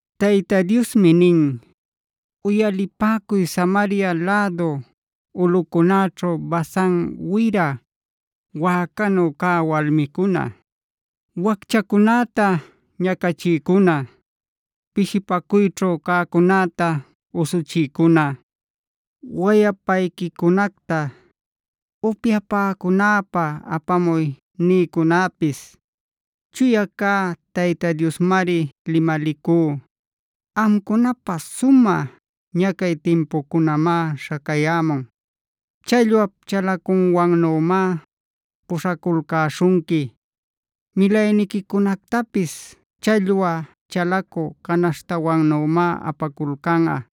Tayta Diosmi nin: “Uyalipäcuy Samaria lädu ulꞌuncunäćhu Basan wira wäcanu cä walmicuna, wacchacunäta ñacachïcuna, pishipacuyćhu cäcunäta usuchïcuna, wayapayquicunacta ‘upyapäcunäpa apamuy’ nïcunäpis. Chuya cä Tayta Diosmari limalicú: ‘Amcunapä sumä ñacay timpucunamá śhacayämun. Challwap chalacuwannümá puśhaculcäśhunqui; milayniquicunactapis challwa chalacü canaśhtawannümá apaculcanꞌa.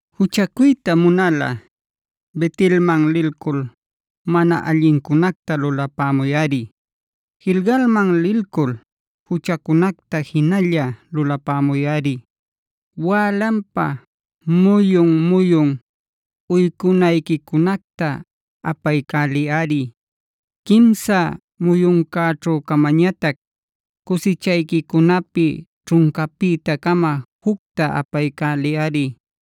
“Juchacuyta munalꞌa Bet-elmana lilcul mana allincunacta lulapämuyꞌari. Gilgalmanb lilcul juchacunacta jinalla lulapämuyꞌari. Wälanpa muyun-muyun uycunayquicunacta apaycäliyꞌari. Quimsa muyuncäćhu-camañatac cusichayquicunapi ćhuncapïta-cama jucta apaycäliyꞌari.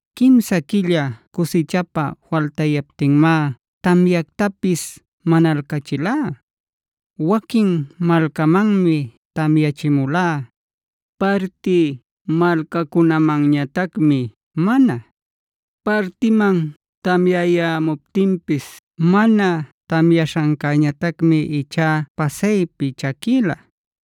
“Quimsa quilla cusichapä faltayaptinmá tamyactapis manalcächilá. Waquin malcamanmi tamyachimulá, parti malcacunamanñatacmi mana. Partiman tamyayämuptinpis mana tamyaśhancäñatacmi ichá pasaypi chaquïla.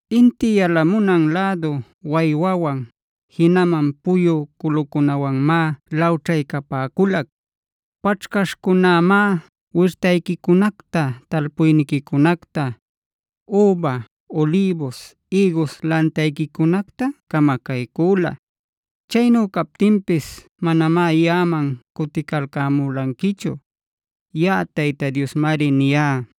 “Inti yalamunan lädu waywawan, jinaman puyu culucunawanmá lawćhaycapäculac. Paćhcaśhcunämá wirtayquicunacta, talpuyniquicunacta, üba, ulïbus, ïgus lantayquicunacta camacaycüla. Chaynu captinpis manamá yaꞌaman cuticalcämulanquichu.c Yaꞌa Tayta Diosmari niyá.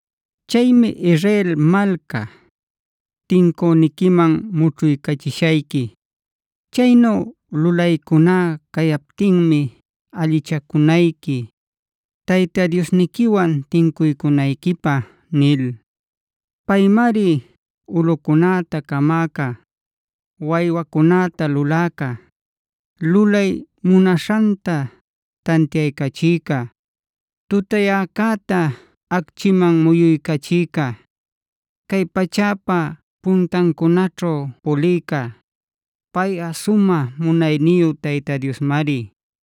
“Chaymi Israel malca, tincüniquiman mućhuycachishayqui. Chaynu lulaycuná cayaptinmi allichacunayqui Tayta Diosniquiwan tincuycunayquipä” nil. Paymari ulꞌucunäta camäca, waywacunäta luläca, lulay munaśhanta tantiaycachïca, tutayäcäta acchiman muyuycachïca, cay pachäpa puntancunaćhu pulïca. Payꞌa sumä munayniyu Tayta Diosmari.